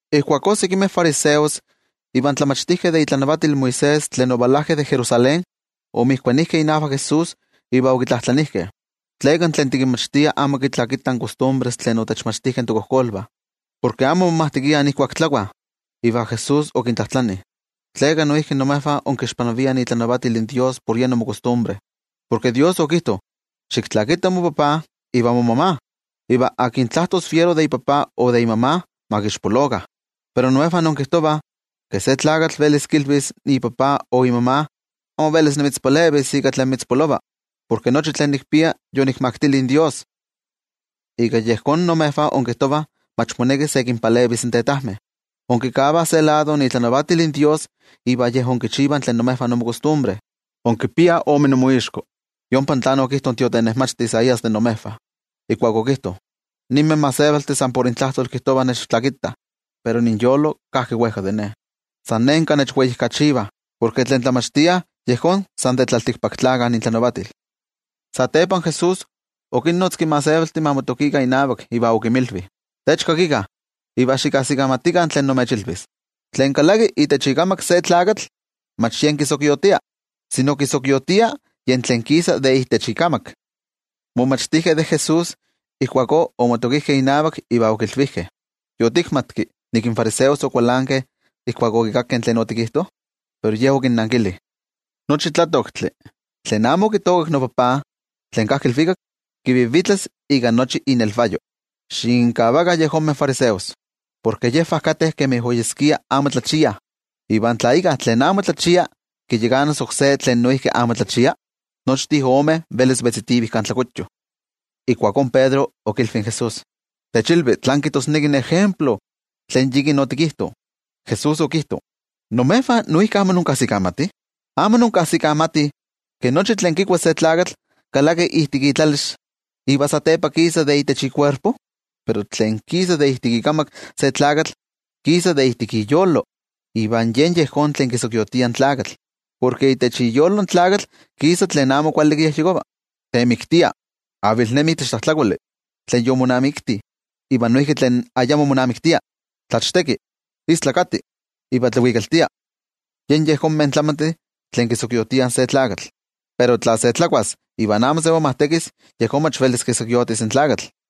Ijkuakó sekimeh fariseos ivan tlamachtijkeh de itlanavatil Moisés tlen ovalajkeh de Jerusalén, omotokijkeh inavak Jesús iva okitlajtlanijkeh: —¿Tleka tlen tikinmachtia amo kitlakitah in kostumbres tlen otechmachtijkeh tokojkolvah? Porke amo momajtekiah ijkuak tlakuah. Iva Jesús okintlajtlani: —¿Tleka noijki imejvah inkixpanaviah itlanavatil Dios por yen inmokostumbre? Porke Dios okijto: “Xiktlakita mopapa iva momama.” Noijki okijto: “Tlen tlajtos fiero de ipapa o de imama, ma kixpolokah.” Pero imejvah inkijtovah ke se tlakatl velis kilvis ipapa o imama: “Amo velis nimitzpalevis ika tlen mitzpolova, porke nochi tlen nikpia, yonikmaktili in Dios.” Ika yejón, imejvah inkijtovah mach moneki se kinpalevis in tetajmeh. Inkikavah se lado itlanavatil in Dios iva yej inkichivah tlen de imejvah inmokostumbre. ¡Inkipiah ome inmoixko! Yompa tlen okijto in tiotenejmachti Isaías de imejvah, ijkuak okijto: Ninmeh gentejtih san por kijtovah nechtlakitah, pero inyolo kajki wejka de Ne. San nenka nechweijkachivah, porke tlen tlamachtiah yejón san de tlaltikpaktlakah intlanavatil. Satepa Jesús okinnotzki in gentejtih ma motokikah inavak iva okinmilvi: —Techkakikah iva xikajsikamatikah tlen nimechilvis: Tlen kalaki itech ikamak se tlakatl mach yen kisokiotia. Tlen kisokiotia yen tlen kisa de itech ikamak. In momachtijkeh de Jesús ijkuakó omotokijkeh inavak iva okilvijkeh: —¿Yotikmatki ke in fariseos okualankeh ijkuak okikakkeh tlen otikijto? Pero Ye okinnankili: —Nochi tlatoktli tlen amo okitookak noTajtzi tlen kajki ilvikak, kivivitlas ika nochi inelvayo. Xikinkavakah yejonmeh fariseos. Porke yejvah kateh kemi oyeskia amo tlachiah. Iva tla íkka tlen amo tlachia kiyakanas oksé tlen noijki amo tlachia, nochtin omeh velis vetzitivih kan tlakuyo. Ijkuakó Pedro okilvi in Jesús: —Techilvi tlán kijtosneki in ejemplo tlen yikin otikijto. Jesús okijto: —¿Imejvah noijki amo inkajsikamatih? ¿Amo inkajsikamatih ke nochi tlen kikua se tlakatl kalaki ijtik itlalix, iva satepa kisa de itech ikuerpo? Pero tlen kisa de ijtik ikamak se tlakatl, kisa de ijtik iyolo, iva yen yejón tlen kisokiotia in tlakatl. Porke de itech iyolo in tlakatl kisa tlen amo kuali kiyejyekova, temiktia, avilnemi itech tlajtlakoli tlen yomonamikti iva noijki tlen ayamo monamiktia, tlachteki, kijtova tlen amo neli iva tlavikaltia. Yen yejonmeh tlamantih tlen kisokiotiah se tlakatl. Pero tla se tlakuas iva amo se momajtekis, yejón mach velis kisokiotis in tlakatl.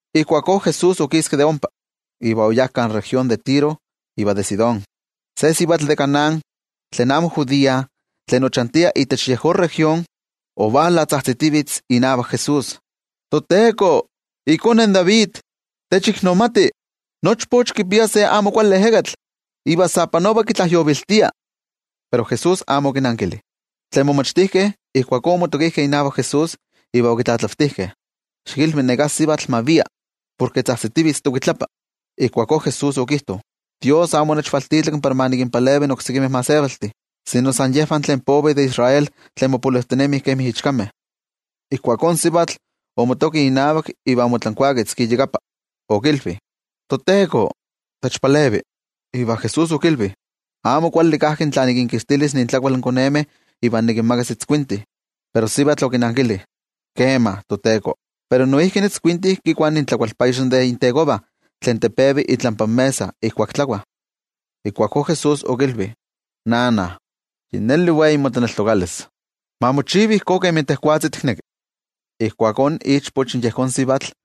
Ijkuakó Jesús okiski de ompa, iva oyá kan región de Tiro iva de Sidón. Se sivatl de Canaán tlen amo judía tlen ochantia itech yejón región, ovala tzajtzitivitz inavak Jesús: —¡ToTeko, ikone in David, techiknomati! Nochpoch kipia se amo kuali ejekatl iva sa panova kitlajyoviltia. Pero Jesús amo okinankili. Tlen momachtijkeh ijkuakó omotokijkeh inavak Jesús iva okitlatlavtijkeh: —Xikilvi neká sivatl ma via, porke tzajtzitivitz tokuitlapa. Ijkuakó Jesús okijto: —Dios amo onechvaltitlanki para ma nikinpalevi oksekimeh gentejtih, sino san yejvah tlen povih de Israel tlen mopolojtinemih kemi ichkameh. Ijkuakó in sivatl omotoki inavak iva omotlankuaketzki iyakapa, okilvi: —¡Tejwatzi noTeko, techpalevi! Iva Jesús okilvi: —Amo kuali kajki tla nikinkixtilis intlakual in konemeh iva nikinmakas in itzkuintih. Pero in sivatl okinankili: —Kema, noTeko, pero in itzkuintih noijki kikuah intlakualpayex de intekovah tlen tepevi itlampa mesa ijkuak tlakuah. Ijkuakó Jesús okilvi: —¡Sivatl, yi neli wei motlaneltokalis! Ma mochiva ijkó kemi tejwatzi tikneki. San nima ijkuakó ovalpajtik ichpoch in yejón sivatl.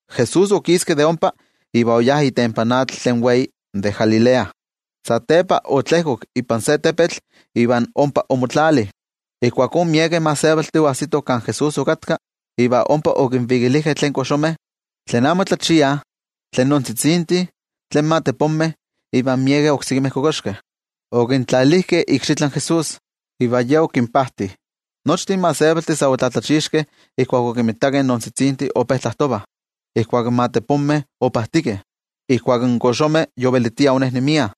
Jesús okiski de ompa iva oyá itempan atl tlen wei de Galilea. Satepa otlejkok ipan se tepetl iva ompa omotlali. Ijkuakó, miekeh gentejtih oajsitoh kan Jesús okatka, iva ompa okinvikilijkeh tlen koxomeh, tlen amo tlachiah, tlen noontzitzintih, tlen matepomeh iva miekeh oksekimeh kokoxkeh. Okintlalijkeh ikxitlan Jesús, iva Ye okinpajti. Nochtin gentejtih sa otlatlachixkeh ijkuak okinmitakeh in noontzitzintih ope tlajtovah, ijkuak in matepomeh opajtikeh, ijkuak in koxomeh yovelitiah onejnemiah,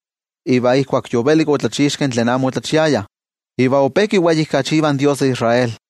iva ijkuak yovelik otlachixkeh tlen amo otlachiayah. Iva ope kiweijkachivah in Dios de Israel.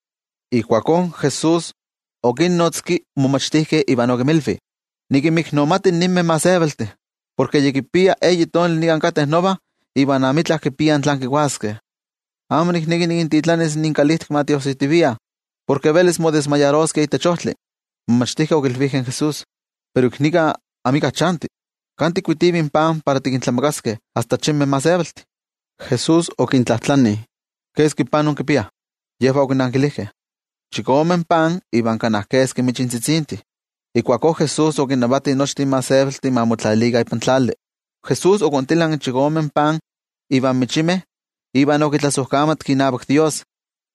Ijkuakó Jesús okinnotzki in momachtijkeh iva okinmilvi: —Nikinmiknomati ninmeh gentejtih, porke yi kipia eyi tonali nika kateh nova iva amitla kipiah tlan kikuaskeh. Amo nikneki nikintitlanis inkalijtik ma tiojsijtiviah, porke velis ixtlioviliskeh ik nepa itech ojtli. In momachtijkeh okilvijkeh in Jesús: —Pero ik nika amika chanti. ¿Kan tikkuitivih pan para tikintlamakaskeh asta achinmeh gentejtih? Jesús okintlajtlani: —¿Keski pan inkipiah? Yejvah okinankilijkeh: —Chikome pan iva kana keski michintzitzintih. Ijkuakó Jesús okinnavati nochtin gentejtih ma motlajtlalikah ipan tlali. Jesús okontilanki in chikome pan ivan michimeh iva okitlasojkamatki inavak Dios.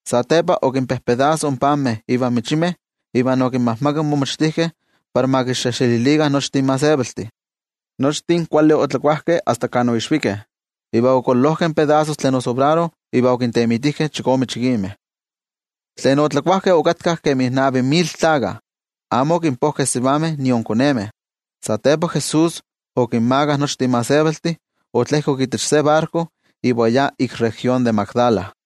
Satepa okinpojpostekki in panmeh ivan michimeh iva okinmajmakak in momachtijkeh para ma kinxejxelilikah nochtin gentejtih. Nochtin kuali otlakuajkeh asta kan oixvikeh. Iva okololojkeh in pedasos tlen osobraro iva okintemitijkeh chikome chikimeh. Tlen otlakuajkeh okatkah kemi navi mil tlakah, amo okinpojkeh in sivameh nion konemeh. Satepa Jesús okinmakah nochtin gentejtih, otlejkok itech se barko iva oyá ik región de Magdala.